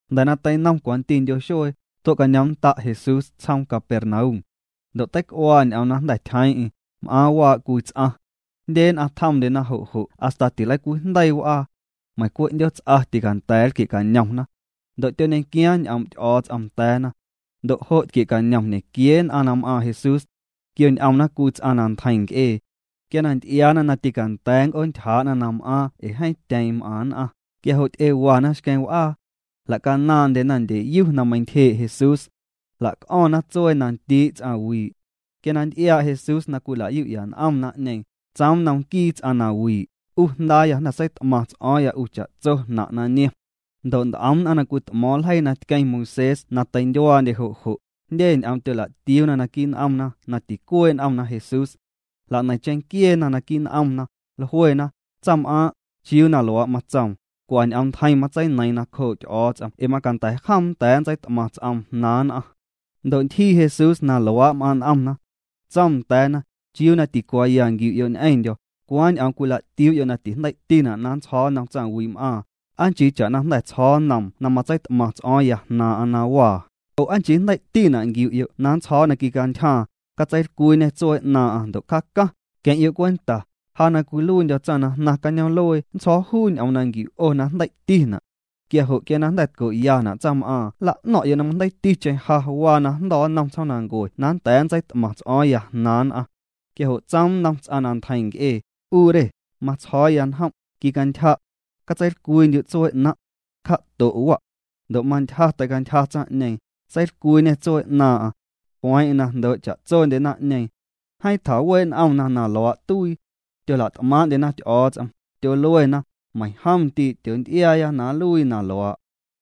Jnda̱ na teinom cwantindyo xuee, tue'cañoomnnda' Jesús tsjoom Capernaum. Ndo' teic'uaa ñ'oom na jnda̱ tyjeeⁿ'eⁿ, m'aaⁿ waa' cwii ts'aⁿ. Jndye nn'aⁿ tjomndyena jo' jo' hasta tileicwiijndeii w'aa. Meiⁿ cwe' 'ndyoots'a tîcanda̱a̱ nlquie'cañomna. Ndo' tyoñequiaaⁿ ñ'oom' Ty'o̱o̱ts'om nda̱a̱na. Ndo' jo' tquie'cañom ñequiee nn'aⁿ na m'aaⁿ Jesús. Tquioñ'omna cwii ts'aⁿ na ntjeiⁿ nc'ee. Quia na nty'iaana na tîcanda̱a̱ nnc'oontyjaa'na na m'aaⁿ ee na jeeⁿ tyeeⁿ m'aⁿ nn'aⁿ, quia jo' ty'ewana xqueⁿ w'aa. Jla'canaaⁿndyena ndyeyu na meintyjee' Jesús. Jla'c'o̱ⁿna tsuee na ndii' ts'aⁿwii'. Quia na nty'iaa' Jesús na cwila'yu'ya n'om naⁿ'ñeeⁿ, tsoom nnom nquii ts'aⁿ na wii': —'U jndaaya, jnda̱ seit'maⁿ ts'o̱o̱ⁿya 'u cha'tso jnaⁿ' na niom. Ndo' nt'om nn'aⁿ na cwit'mo̱o̱ⁿ ljeii na tqueⁿ Moisés na teindyuaandye jo' jo', jndye ñ'oom tyola'tiuuna naquii' n'omna na ticuee' n'omna Jesús. Jla'neiⁿ cheⁿnquieena naquii' n'omna, jluena: “Tsaⁿm'aaⁿ' ¿chiuu na luaa' matsoom? Cwa ñ'oom ntjeiⁿ matseineiiⁿ nacjoo' Ty'o̱o̱ts'om ee macanda̱ jom nnda̱a̱ nntseit'maⁿ ts'oom jnaaⁿ nn'aⁿ.” Ndo' ntyjii Jesús na luaa' m'aaⁿ' n'omna. Tsoom nda̱a̱na: —¿Chiuu na ticuaaya nquiu'yo' ñ'eⁿndyo̱? ¿Cwaaⁿ ñ'oom cwila'tiuu'yo' na tijndei'tina' na nntsjo̱o̱ nnom tsaⁿwii'm'aaⁿ? ¿Aa nchii cha'na jnda̱ tsjo̱o̱ nnoom na matseit'maⁿ ts'o̱o̱ⁿya jnaaⁿ'aⁿ na waa? Oo ¿aa nchii jndei'tina' nquiu'yo' na nntsjo̱o̱ na quicantyjaaⁿ, catseilcwiiñê tsuee 'naaⁿ'aⁿ ndo' cjaacaⁿ? Queⁿ'yo' cwenta, ja na cwiluiindyo̱ tsaⁿ na jnaⁿ cañoom'luee nntsjo̱o̱ juu ñ'oom na nquiu' 'o na jndei'tina'. Quia jo' quia na jnda̱ tco'yana' tsaⁿm'aaⁿ nla'no̱ⁿ'yo' na majndeiiticheⁿ ja waa najndo̱ nnom tsjoomnancue na nnda̱a̱ nntseit'maⁿ ts'o̱o̱ⁿya jnaaⁿ nn'aⁿ. Quia jo' tsoom nnom ts'aⁿ na ntjeiⁿ nc'ee: —'U re, matsjo̱o̱ya njom', quicantyja'. Catseilcwiindyu' tsuee 'naⁿ'. Cja'to' wa'. Ndo' mantyja teicantyja tsaⁿ'ñeeⁿ, seilcwiiñê tsuee 'naaⁿ'aⁿ. Jlueeⁿ'eⁿ na jndoo' cha'tsondye naⁿ'ñeeⁿ. Jeeⁿ tjawee' n'omna na luaa' tuii. Tyola't'maaⁿ'ndyena Ty'o̱o̱ts'om, tyoluena: —Meiⁿjom ndii' tyoonty'iaaya na nluii na luaa'.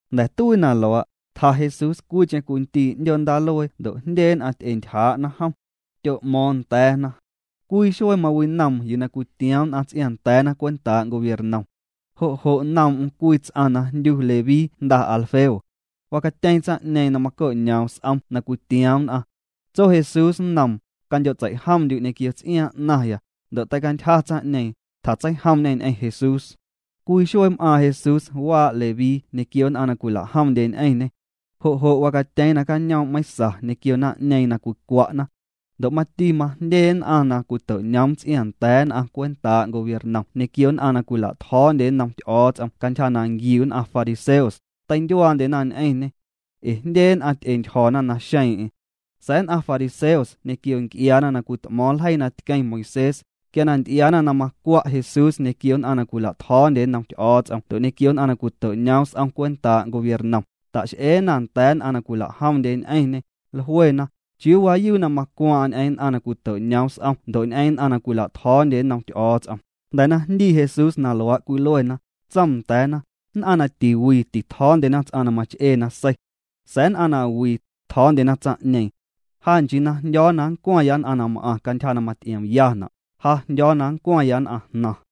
Jnda̱ tuii na luaa', tja Jesús cwiicheⁿ cwii ndii' 'ndyoo ndaaluee ndo' jndye nn'aⁿ ty'entyjaa'na jom. Tyo'mo̱o̱ⁿ nda̱a̱na. Cwii xuee mawinoom yuu na cwitioom nn'aⁿ ts'iaaⁿnda̱a̱na cwentaa' gobiernom. Jo' jo' noom'm cwii ts'aⁿ na jndyu Leví jnda Alfeo. Wacatyeeⁿ tsaⁿ'ñeeⁿ na maco'ñoom s'om na cwitioom nn'aⁿ. Tso Jesús nnoom: —Candyo'tseijomndyu' ñequio ts'iaaⁿ 'naⁿya. Ndo' teicantyja tsaⁿ'ñeeⁿ, tjatseijomñe ñ'eⁿ Jesús. Cwii xuee m'aaⁿ Jesús waa' Leví ñequio nn'aⁿ na cwila'jomndye ñ'eⁿñê. Jo' jo' wacatyeeⁿ nacañoom' meiⁿsa ñequio naⁿ'ñeeⁿ na cwicwa'na. Ndo' mati majndye nn'aⁿ na cwito'noom ts'iaaⁿnda̱a̱ nn'aⁿ cwentaa' gobiernom ñequio nn'aⁿ na cwila'tjo̱o̱ndye nnom Ty'o̱o̱ts'om cantyja na nquiu nn'aⁿ fariseos, teindyuaandyena ñ'eⁿñê. Ee jndye nn'aⁿ ty'entyjo̱na naxeeⁿ'eⁿ. Sa̱a̱ nn'aⁿ fariseos ñequio nc'iaana na cwit'mo̱o̱ⁿ ljeii na tqueⁿ Moisés, quia na nty'iaana na macwa' Jesús ñequio nn'aⁿ na cwila'tjo̱o̱ndye nnom Ty'o̱o̱ts'om ndo' ñequio nn'aⁿ na cwito'ñoom s'om cwentaa' gobiernom, ta'x'eena nda̱a̱ nn'aⁿ na cwila'jomndye ñ'eⁿñê, jluena: —¿Chiuu waayuu na macwaaⁿ'aⁿ ñ'eⁿ nn'aⁿ na cwito'ñoom s'om ndo' ñ'eⁿ nn'aⁿ na cwila'tjo̱o̱ndye nnom Ty'o̱o̱ts'om? Jnda̱ na jndii Jesús na luaa' cwiluena, tsoom nda̱a̱na: —Nn'aⁿ na tiwii titjo̱o̱ndyena ts'aⁿ na mach'ee nasei. Sa̱a̱ nn'aⁿ na wii, tjo̱o̱ndyena tsaⁿ'ñeeⁿ. Ja nchii na jndyo̱o̱ na nncwaⁿya nn'aⁿ na m'aⁿ cantyja na maty'iomyana', ja jndyo̱o̱ na nncwaⁿya nn'aⁿjnaⁿ.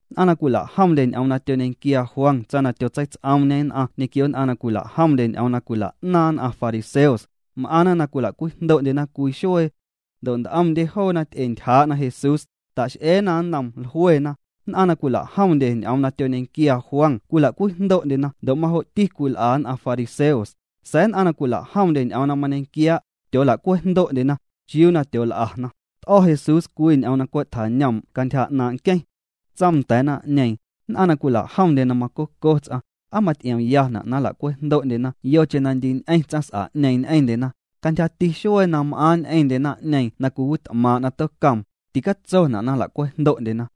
Nn'aⁿ na cwila'jomndye ñ'oom na tyoñequiaa Juan tsaⁿ na tyotseits'oomñe nn'aⁿ ñequio nn'aⁿ na cwila'jomndye ñ'oom na cwila'naaⁿ nn'aⁿ fariseos, m'aⁿna na cwila'cwejndo'ndyena cwii xuee. Ndo' nt'omndye joona ty'entyjaa'na Jesús, ta'x'eena nnoom, jluena: —Nn'aⁿ na cwila'jomndye ñ'oom na mañequiaa Juan cwila'cwejndo'ndyena ndo' majo'ti cwil'a nn'aⁿ fariseos, sa̱a̱ nn'aⁿ na cwila'jomndye ñ'oom na mañequiaa', tyoola'cwejndo'ndyena. ¿Chiuu na tyool'ana? T'o̱ Jesús cwii ñ'oom na cwe' tjañoom' cantyja 'naaⁿ' nqueⁿ. Tsoom nda̱a̱ naⁿ'ñeeⁿ: —Nn'aⁿ na cwila'jomndye na macoco ts'aⁿ ¿aa maty'iomna' na nla'cwejndo'ndyena yocheⁿ na ndii ñ'eⁿ tsaⁿs'a'ñeeⁿ ñ'eⁿndyena? Cantyjati xuee na m'aaⁿ ñ'eⁿndye naⁿ'ñeeⁿ na cwiwit'maaⁿ' na tocoom, ticatsona' na nla'cwejndo'ndyena.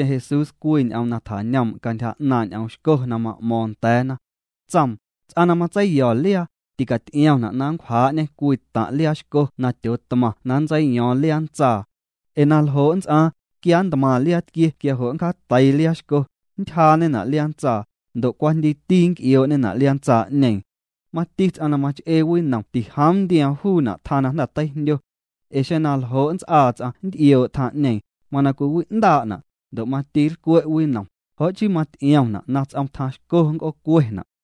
Seineiⁿticheⁿ Jesús cwii ñ'oom na tjañoom' cantyja 'naaⁿ' ñ'oom xco na ma'mo̱o̱ⁿ nda̱a̱na. Tsoom: —Ts'aⁿ na matseiyo̱ liaa, ticaty'iomna' na nncwjaa'ñê cwii taⁿ' liaa xco na tyootmaⁿ na nntseiyo̱o̱ⁿ liaa ntsaa. Ee na ljo' nnts'aaⁿ, quia nntmaⁿ liaa tquie quia jo' nncjaateii liaa xco, nntyjaañena' liaa ntsaa, ndo' cwajndiiti nnc'ioo'ñena' liaa ntsaa'ñeeⁿ. Mati ts'aⁿ na mach'ee winom tijoom nntioom juuna' tjaⁿ na jnda̱ teijndyo. Ee xeⁿ na ljo' nnts'aa ts'aⁿ nnt'ioo' tjaⁿ'ñeeⁿ, mana cwiwi'ndaa'na', ndo' mati nlcwe' winom. Jo' chii maty'iomna' na ts'om tjaⁿ xco nnc'oocuena'.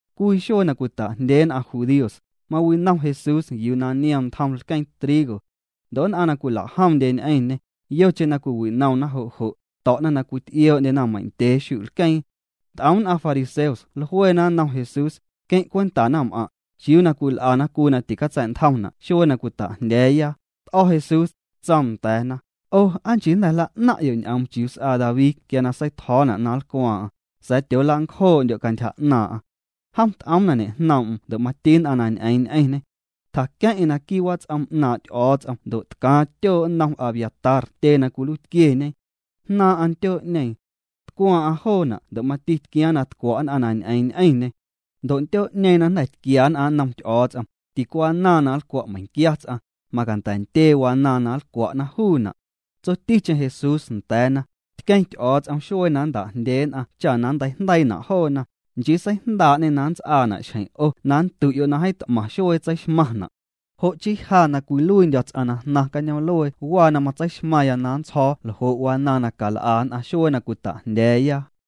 Cwii xuee na cwita'jndyee nn'aⁿ judíos, mawinom Jesús yuu na niom ntjom lqueeⁿ trigo. Ndo' nn'aⁿ na cwila'jomndye ñ'eⁿñê, yocheⁿ na cwiwinomna jo' jo', to̱'na na cwit'ioo'ndyena meiⁿ ndyee xu'lqueeⁿ. Nt'om nn'aⁿ fariseos jluena nnom Jesús: —Queⁿ' cwenta naⁿm'aⁿ', ¿chiuu na cwil'ana cwii na ticatsa̱'ntjomna' xuee na cwita'jndya̱a̱ya? T'o̱ Jesús, tsoom nda̱a̱na: —'O, ¿aa nchii jnda̱ jla'naⁿ'yo' ñ'oom chiuu s'aa David quia na seitjo̱o̱na' na nlcwaaⁿ'aⁿ? Sa̱a̱ tyoolancjoo'ndyo' cantyja 'naaⁿ'aⁿ. Jom t'oom na ñejnoom'm ndo' mati nn'aⁿ na ñ'eeⁿ ñ'eⁿñê. Tjaqueⁿ'eⁿ naquii' wats'om 'naaⁿ' Ty'o̱o̱ts'om ndo' tcaaⁿ tyoo' nnom Abiatar tyee na cwiluiitquieñe. Jnaaⁿ'aⁿ ntyoo'ñeeⁿ. Tcwaaⁿ'aⁿ joona' ndo' mati tquiaaⁿ na tcwa' nn'aⁿ na ñ'eeⁿ ñ'eⁿñê. Ndo' ntyoo'ñeeⁿ na jnda̱ tquia nn'aⁿ nnom Ty'o̱o̱ts'om, ticwanaaⁿ na nlcwa' meiⁿnquia ts'aⁿ, macanda̱ ntyee wanaaⁿ na nlcwa'na juuna'. Tsoticheⁿ Jesús nda̱a̱na: —Tqueⁿ Ty'o̱o̱ts'om xuee na nnta'jndyee nn'aⁿ cha na nnteijndeiina' joona, nchii seijndaa'ñê na nnts'aana' xjeⁿ 'o na nndu'yo' na jeeⁿ t'maⁿ xuee tseixmaⁿna'. Jo' chii ja na cwiluiindyo̱ ts'aⁿ na jnaⁿ cañoom'luee waa na matseixmaⁿya na nntsjo̱o̱ ljo' wanaaⁿ na cal'a nn'aⁿ xuee na cwita'jndya̱a̱ya.